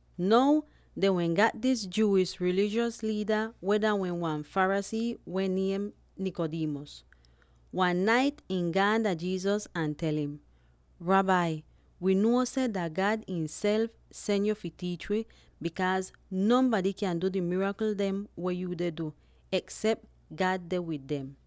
Now, dehn wehn gat dis Jewish rilijos liida weh dah wehn wan Pharisee weh niem Nicodemus. Wan nait ihn gaan dah Jesus ahn tel im, “Rabbi, wii nuo seh dah God ihnself sen yuu fi tiich wi, bikaaz nonbady kyaahn du di mirakl dem weh yuu deh du, eksep God deh wid dem.”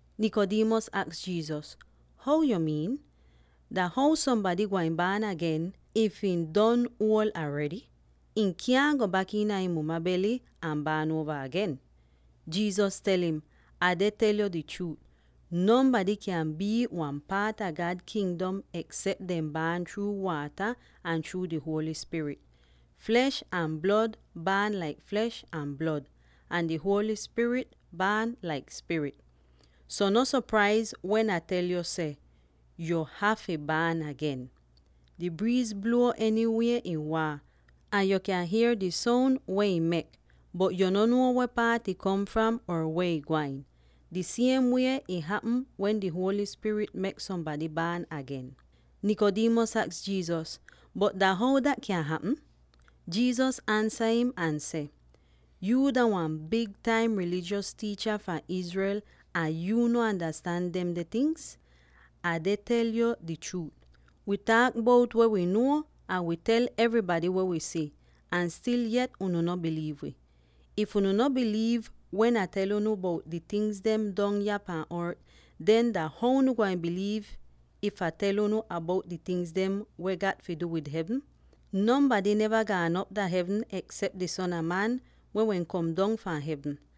Nicodemus aks Jesus, “How yu miin? Dah how sombady gwain baan agen, if ihn don uol aredy? Ihn kyaahn go bak iina ihn muma bely ahn baan uova agen!” Jesus tel im, “Hier dis chruut weh Ah deh tel yo: nonbady kyaahn bii wan paat a God Kingdom eksep dehn baan chruu waata, ahn chruu di Holy Spirit. Flesh ahn blod baan laik flesh ahn blod, ahn di Holy Spirit baan laik spirit. So no sopraiz wen Ah tel yo seh, ‘Yuu hafy baan agen.’ Di briiz bluo enywie ih waahn, ahn yo kyan hier di soun weh ihn mek, bot yo no nuo weh paat ih kom fram or weh ih gwain. Di siem wie ih hapm wen di Holy Spirit mek sombady baan agen.” Nicodemus aks Jesus, “Bot dah how dat kyan hapm?” Jesus ansa im ahn seh, “Yuu dah wan big taim rilijos tiicha fahn Israel ahn yuu no andastan demde tingz? Ah deh tel yu di chruut: wii taak bout weh wi nuo, ahn wi tel evrybady weh wi si, ahn stil yet unu no biliiv wi. If unu no biliiv wen Ah tel unu bout di tingz dem dong yah pahn ort, den dah how unu gwain biliiv if Ah tel unu bout di tingz dem weh gat fi du wid hevn? Nonbady neva gaan op iina hevn eksep di Son a Man, weh wehn kom dong fahn hevn.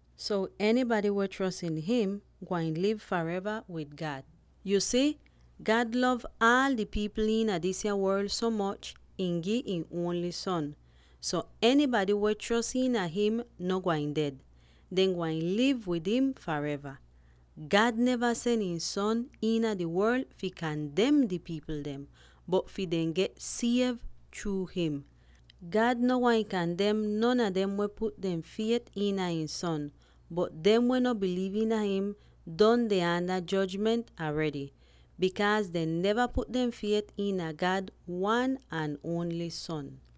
so enybady weh chros iina him gwain liv fareva wid God. “Yu si, God lov aal di pipl iina disya worl so moch ihn gi ihn ongl Son; so enybady weh chros iina him no gwain ded; dehn gwain liv wid im fareva. God neva sen ihn Son iina di worl fi kandem di pipl dem, bot fi dem get siev chruu him. God no gwain kandem non a dem weh put dehn fiet iina ihn Son, bot dem weh no biliiv iina him, don deh aanda jojment aredy, bikaaz dehn neva put dehn fiet iina God wan ahn ongl Son.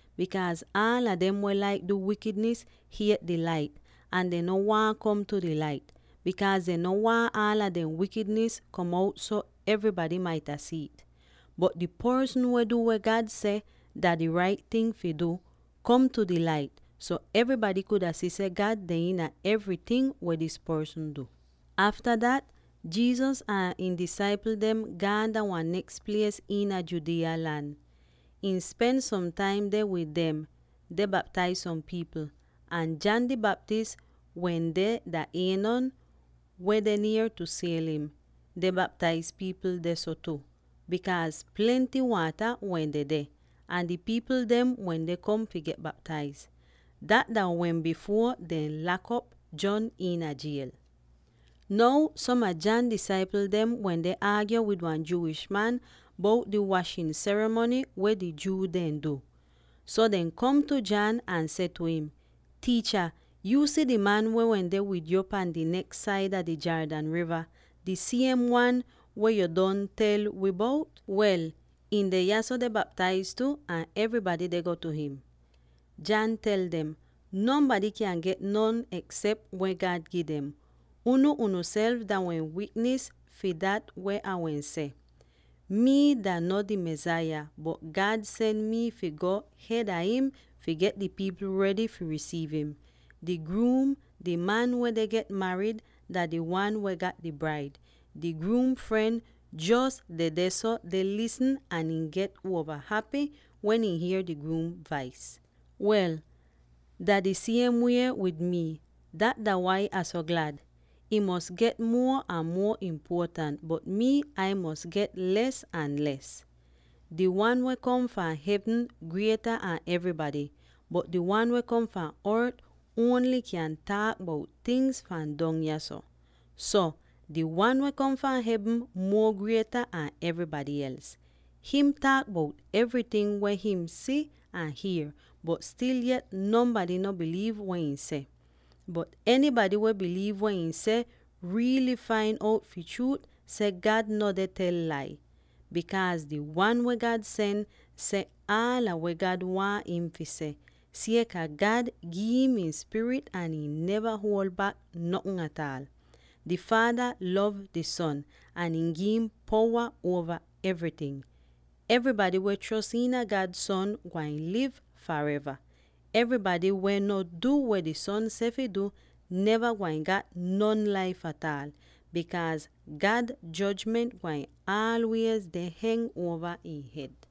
Bikaaz aala dem, weh laik du wikidnis, hiet di Lait ahn dehn no waahn kom tu di Lait, bikaaz dehn no waahn aala dehn wikidnis kom out so evrybady maita si'it. Bot di porsn, weh du weh God seh dah di rait ting fi du, kom tu di Lait, so evrybady kuda si seh God deh iina evryting weh dis porsn du.” Afta dat, Jesus ahn ihn disaipl dem gaan dah wan neks plies iina Judea lan. Ihn spen som taim deh wid dem, deh baptaiz som pipl. Ahn John di Baptist wende dah Aenon —weh deh nier tu Salim— deh baptaiz pipl dehso tu, bikaaz plenty waata wehn dedeh, ahn di pipl dem wende kom fi get baptaiz. Dat dah wehn bifuor dehn lak'op John iina jiel. Now som a John disaipl dem wende aagyo wid wan Jewish man bout di washin serimony weh di Jew dehn du. So, dehn kom tu John ahn seh tu im, “Tiicha, yu si di man weh wende wid yo pahn di neks saida di Jordan riva, di siem wan weh yo don tel wi bout? Wel, ihn deh yahso deh baptaiz tu, ahn evrybady deh go tu him.” John tel dem, “Nonbady kyaahn get notn eksep weh God gi dem. Unu unuself dah wehn wiknis fi dat weh Ah wehn seh, ‘Mii dah no di Mesaya, bot God sen mi fi go hed a im fi get di pipl redy fi risiiv im.’ Di gruum —di man weh deh get marid— dah di wan weh gat di braid. Di gruum fren jos dedeh deh lisn, ahn ihn get uova hapy wen ihn hier di gruum vais. Wel, dah di siem wie wid mii; dat dah wai Ah so glad. Ihn mos get muo ahn muo impuotant, bot mii, Ah mos get les ahn les. “Di Wan weh kom fahn hevn grieta an evrybady, bot di wan weh kom fahn ort ongl kyan taak bout tingz fahn dong yahso. So, di Wan weh kom fahn hevn muo grieta an evrybady els. Him taak bout evryting weh him si ahn hier, bot stil yet, nonbady no biliiv weh ihn seh. Bot enybady weh biliiv weh ihn seh riily fain out fi chruut seh God no deh tel lai. Bikaaz di Wan weh God sen seh, aala weh God waahn im fi seh, sieka God gi'im ihn Spirit ahn ihn neva huol bak notn ataal. Di Faada lov di Son, ahn ihn gi'im powa uova evryting. Evrybady weh chros iina God Son gwain liv fareva; evrybady weh no du weh di Son seh fi du, neva gwain gat non laif ataal, bikaaz God jojment gwain aalwiez deh heng uova ihn hed.”